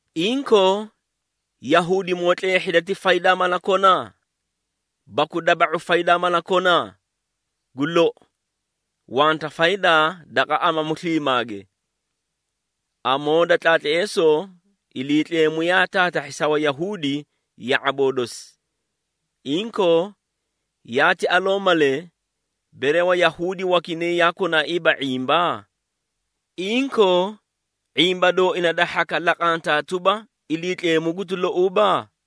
Inkoo, Yahuudimoo tleehhida ti faydaa mala kona? Baku daba⁄u faydaa mala kona? Gu lou, wanta faydaa daqa amamu sliimaage. Amoo da tlaatleesoo, Iliitleemu yaa taatahhi sa Wayahuudi ya⁄aboo dosi. Inkoo, yaati aloo malee, bere Wayahuudi wakinay yaa konaaiiba ⁄imba? Inkoo, ⁄imba dooina da hhaka laqantaa tuba, Iliitleemu guti louuba?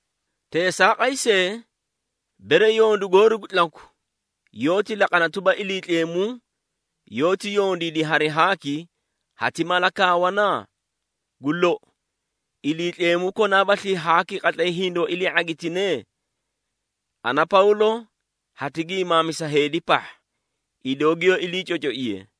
Teesaaqay see, bere yondu goori gu tlaku, yoóti laqana tuba, Iliitleemu yoóti yondiidi hari haaki, hati mala kaawana? Gu lou, Iliitleemu konaabaslii haaki qatlay hindoó ilii ⁄agitine? (Ana, Pawlo hati giimaamisa heedi pahha, idoo giyoó ilii cocoiye).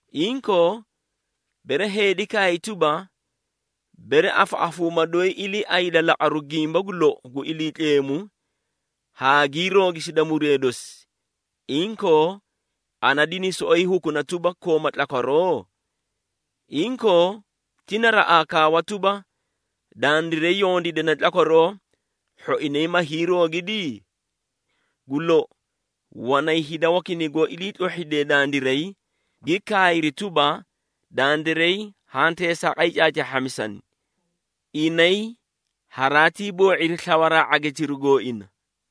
Inkoo, bere heedi kaay tuba, “Bere afaꞌafuuma doyi iliiayda laqaru gimba gu lou gu Iliitleemu haa gii roogisida muree dosi, inkoo ana dini soꞌoyi hukuna tuba, kooma tlakwaroo?” Inkoo, ti naraꞌaa kaawa tuba, “Dandiray yondiidane tlakwaroo, hhoinay ma hiiroogidi?” Gu lou, wanay hida wakinay goó iliitlohhidee dandiray, gi kaayri tuba, dandiray haã teesaaqay caacaahhamisani. Inay haraatii boo⁄iri slawa ⁄agitiru gooina!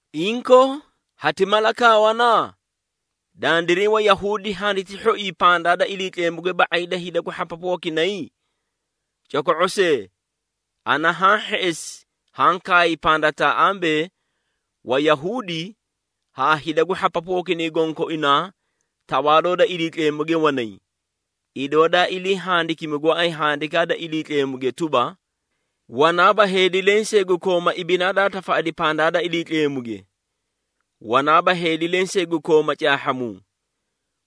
Inkoo, hati mala kaawana? Dandiray Wayahuudi handiti hhoii pandaa da Iliitleemuge ba⁄ay da hida gu hhapapu wakinay? Coko⁄o see! Ana haã hheꞌesi haã kaay pandataa ambee, Wayahuudi haa hida gu hhapapu wakinay gonkoinaa tawaaloo da tlakwarooge wanay. Idoo daa ilii handikimi gooay Handikaa da Iliitleemuge tuba, “Wanaaba heedi lensee gu koomaa ibinaa daa tafaꞌadi pandaa da Iliitleemuge! Wanaaba heedi lensee gu kooma caahhamuu,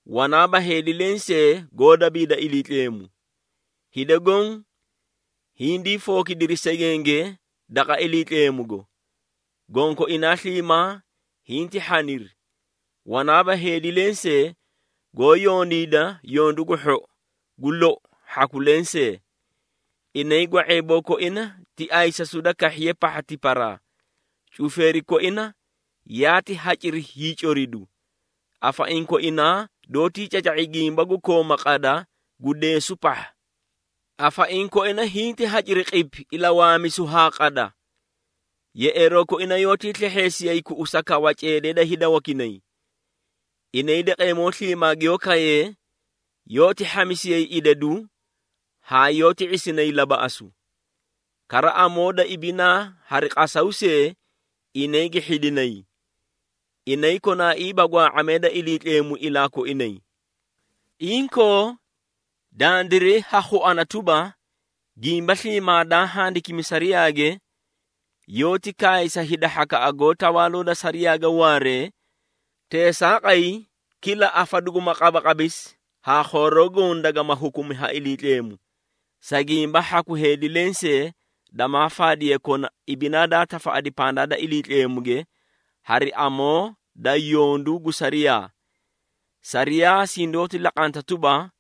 wanaaba heedi lensee goó dabiida Iliitleemu. Hida goõ hindii fookidiri segenge daqa Iliitleemugo, gonkoinaa sliimaa hinti hhaniri. Wanaaba heedi lensee goó yondiida yondu gu hhou, gu lou hhaku lensee.” “Inay gwa⁄eeboo koina ti ayisasu da kahhiye pahha tiparaa, cufeeri koina yaati haciri hiicoridu.” “Afaiĩ koinaa doótii caca⁄i gimba gu kooma qada gu deesu pahha.” “Afaiĩ koina hinti haciri qipi ilawaamisu haa qada.” “Yeꞌeeroo koina yoótii slehheesiyay kuꞌusa kawa ceedee da hida wakinay. Inay daqeemoo sliimaa giyoó kayee, yoóti hhamisiyay idadu haa yoóti ⁄isinay labaꞌasu. Kara, amoo da ibinaa hari qasaw see inay gi hhidinay.” “Inay konaaiiba gwaa⁄amee da Iliitleemu ilaa koinay.” Inkoo, dandiray ha khuana tuba, gimba sliimaa daa handikimi sariyaage, yoóti kaay sa hida hhakaꞌa goó tawaaloo da sariyaage waaree, teesaaqay kila afa duguma qabaqabisi haa khooroo goõ dagama hukumi ha Iliitleemu. Sa gimba hhaku heedi lensee damaa faadiye kona ibinaa daa tafaꞌadi pandaa da Iliitleemuge hari amoo da yondu gu sariyaa. Sariyaa sindoóti laqanta tuba,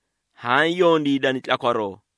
haã yondiidani tlakwaroo.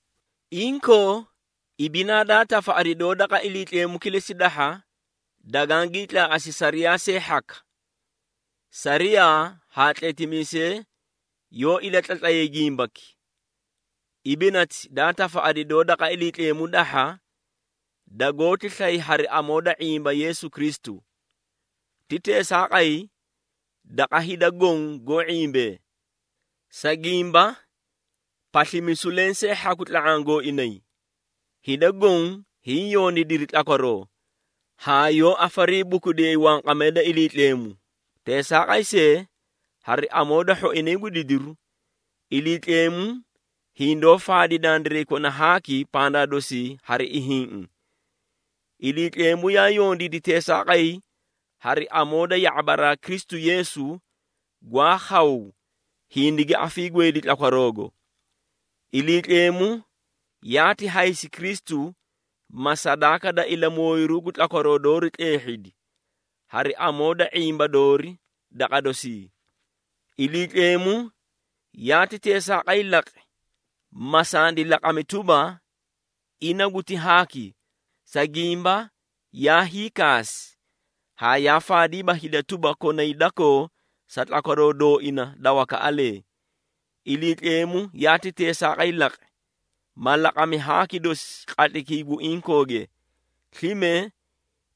Inkoo, ibinaa daa tafaꞌadi doó daqa Iliitleemu kilesi dahha, dagagiĩ tlaaꞌasi sariyaa see hhaka. Sariyaa haa tletimiisee yoó ilatlatlayay gimbaki. Ibinati daa tafaꞌadi doó daqa Iliitleemu dahha, dagoóti slay hari amoo da ⁄imba Yeesu Kristu. Ti teesaaqay, daqa hida goõ goó ⁄imbee, sa gimba paslimisu lensee hhaku tla⁄aã gooinay. Hida goõ hiĩ yondiidiri tlakwaroo haa yoó afariibukudiyayi wanqamee da Iliitleemu. Teesaaqay see, hari amoo da hhoinay gu didiru, Iliitleemu hindoó faadi dandiray kona haaki pandaa dosii hari ihiĩꞌi. Iliitleemu yaa yondiidi teesaaqay hari amoo da ya⁄abaraa Kristu Yeesu gwaa khaw hindigi afiigweedi tlakwaroogo. Iliitleemu yaati haysi Kristu, ma sadaaka da ilamooyiru gu tlakwaroo doori tleehhidi, hari amoo da ⁄imba doori daqa dosii. Iliitleemu yaati teesaaqay laqi, ma sandi laqami tuba, ina guti haaki, sa gimba yaa hiikaasi haa yaa faadiiba hida tuba, konay dakoo sa tlakwaroo dooina da wakaꞌalee. Iliitleemu yaati teesaaqay laqi, ma laqami haaki dosi qatlaykii gu inkooge. Slime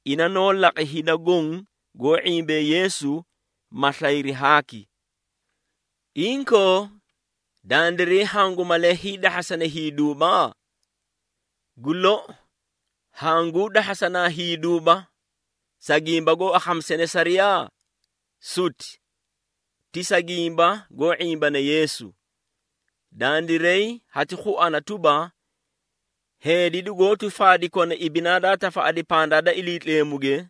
ina noó laqi hida goõ goó ⁄imbee Yeesu, ma slayri haaki. Inkoo, dandiray hangu malee hiidahhasana hiiduuba? Gu lou, hanguu dahhasanaa hiiduuba, sa gimba goó akhamisane sariyaa? Suti! Ti sa gimba goó ⁄imbane Yeesu. Dandiray hati khuana tuba, heedi dugoóti faadi kona ibinaa daa tafaꞌadi pandaa da Iliitleemuge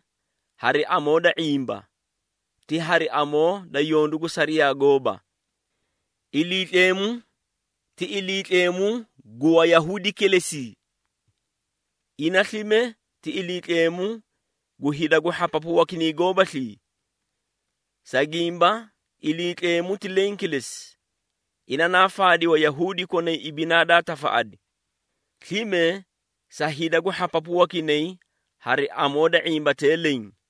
hari amoo da ⁄imba, ti hari amoo da yondu gu sariyaa gooba. Iliitleemu ti Iliitleemu gu Wayahuudi kilesi? Ina slime ti Iliitleemu gu hida gu hhapapu wakinay goobaslii? Sa gimba Iliitleemu ti leẽ kilesi, ina naa faadi Wayahuudi konay ibinaa daa tafaꞌadi, slime sa hida gu hhapapu wakinay hari amoo da ⁄imbatee leẽ.